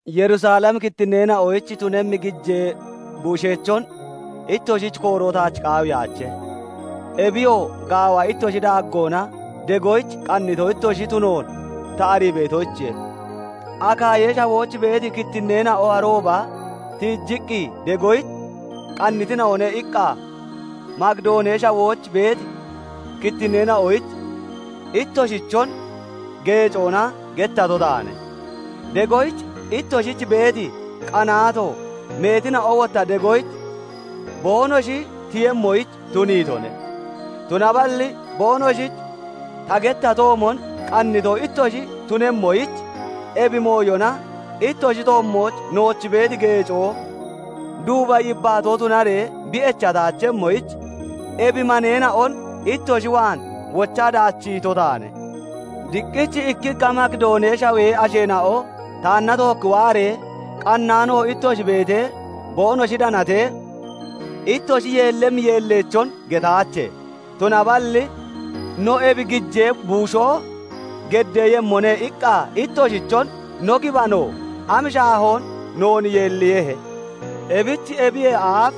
Yerusalemi kittinneena'oyich tunemmi gijee buusheechon ittoshich kooroo taach qaawiyaache; Ebiyoo, gaawa ittoshi daaggoona degoyich qannito ittoshi tunoon ta arii beetoyichiye. "Akaayee Shawooch beeti kittinneena'o aannooba tiijiqqi degoyich qannitina'one" iqqa Makidoonee Shawooch beeti kittinneena'oyich ittoshichon geecoona gettato taane. Degoyich ittoshich beeti qanaato meetina'o wotta degoyich boonoshi tiyemmoyich tuniitone. Tunaballi boonoshich ta gettatoomon qannito ittoshi tunemmoyich, ebi mooyona ittoshi toommooch nooch beeti geecoo duuba yibbaatoo tunaree bi echataachemmoyich, ebi maneena'on ittoshi waan wochaa daachiito taane. Diqqich ikkikka Makidoonee Shawee asheena'o taanna tookki waaree, qannaano ittoshi beetee boonoshi danatee, ittoshi yeellemmi yeelleechon getaache; tunaballi no "Ebi gijee buushoo geddeeyemmone" iqqa ittoshichon no gibano am shaahoon noon yeelliiyehe! Ebich ebiyee aaf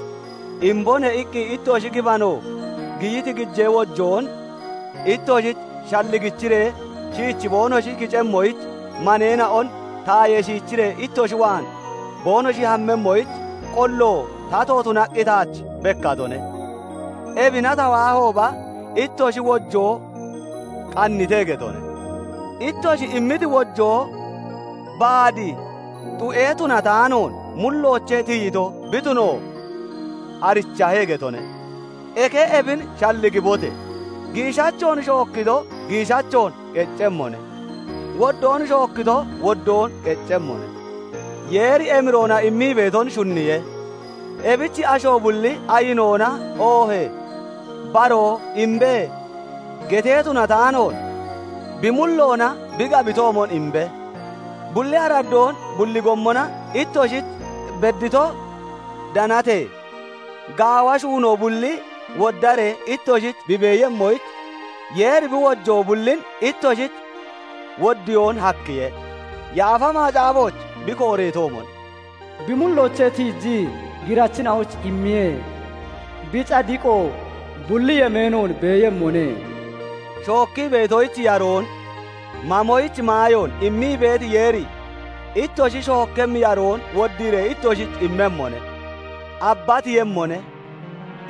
"Imbone" iqqi ittoshi gibano giyiti gijee wojoon ittoshich shalligichiree shiichi boonoshi kicemmoyich, maneena'on tayee shiichiree ittoshi waan boonoshi hammemmoyich qollo tato tunaqqi taach bekkatone. Ebina ta waahooba, ittoshi wojoo qannite getone; ittoshi immiti wojoo baad xu'e tunataanoon mulloochee tiyito bi tuno arichahe getone. Eke ebin shalligibote! Giishachoon shookkito giishachoon qeccemmone; woddoon shookkito woddoon qeccemmone. Yeeri emiroona immii beeton shunniye; ebich asho bulli ayinoona oohee baroo "Imbe!" getee tunataanoon, bi mulloona bi gabitoomon imbe. Bulli araddoon bulli gommona ittoshich beddito danatee, gaawa shuunoo bulli woddaree ittoshich bi beeyemmoyich, Yeeri bi wojoo bullin ittoshich woddiyoon hakkiye. Yaafa Macaafooch bi kooreetoomon, Bi mulloochee tiijii girachina'oyich immiye; bi cadiqoo bulli yemeenoon beeyemmone. Shookkii beetoyich yaroon, mamoyich maayoon immii beeti Yeeri ittoshi shookkemmi yaroon woddiiree ittoshich immemmone; abbatiiyemmone;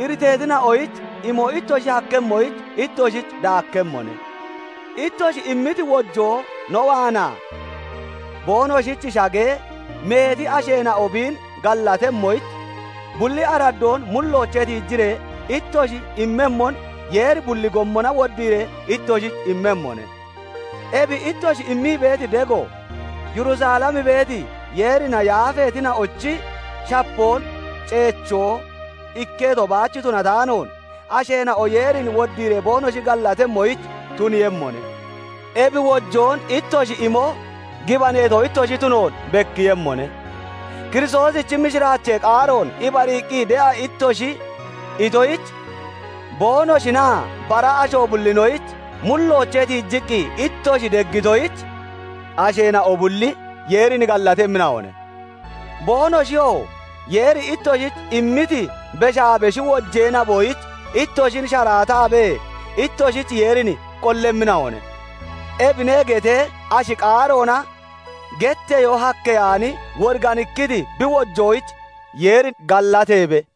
iriteetina'oyich imo ittoshi hakkemmoyich ittoshich daakkemmone. Ittoshi immiti wojoo no waanaa boonoshich shagee, meeti asheena'o biin gallatemmoyich, bulli araddoon mulloochee tiijiree ittoshi immemmon Yeeri bulli gommona woddiiree ittoshich immemmone. Ebi ittoshi immii beeti dego, Yerusalem beeti, Yeerina yaafeetina'ochi shapoon ceechoo ikketo baach tunataanoon, asheena'o Yeerin woddiiree boonoshi gallatemmoyich tuniiyemmone. Ebi wojoon ittoshi imo gibaneeto ittoshi tunoon bekkiiyemmone; Kiristoosichi mishiraachee qaaroon ibariiqqi de'a ittoshi itoyich, boonoshinaa bara asho bullinoyich mulloochee tiijiqqi ittoshi deggitoyich, asheena'o bulli Yeerin gallatemmina'one. Boonoshiyoo Yeeri ittoshich immiti beshaa beshi wojee naboyich ittoshin sharaatabee ittoshich Yeerin qollemmina'one. "Ebine" getee ashi qaaroona getteyoo hakkeyaani, woriganikkiti bi wojoyich Yeeri gallateebe.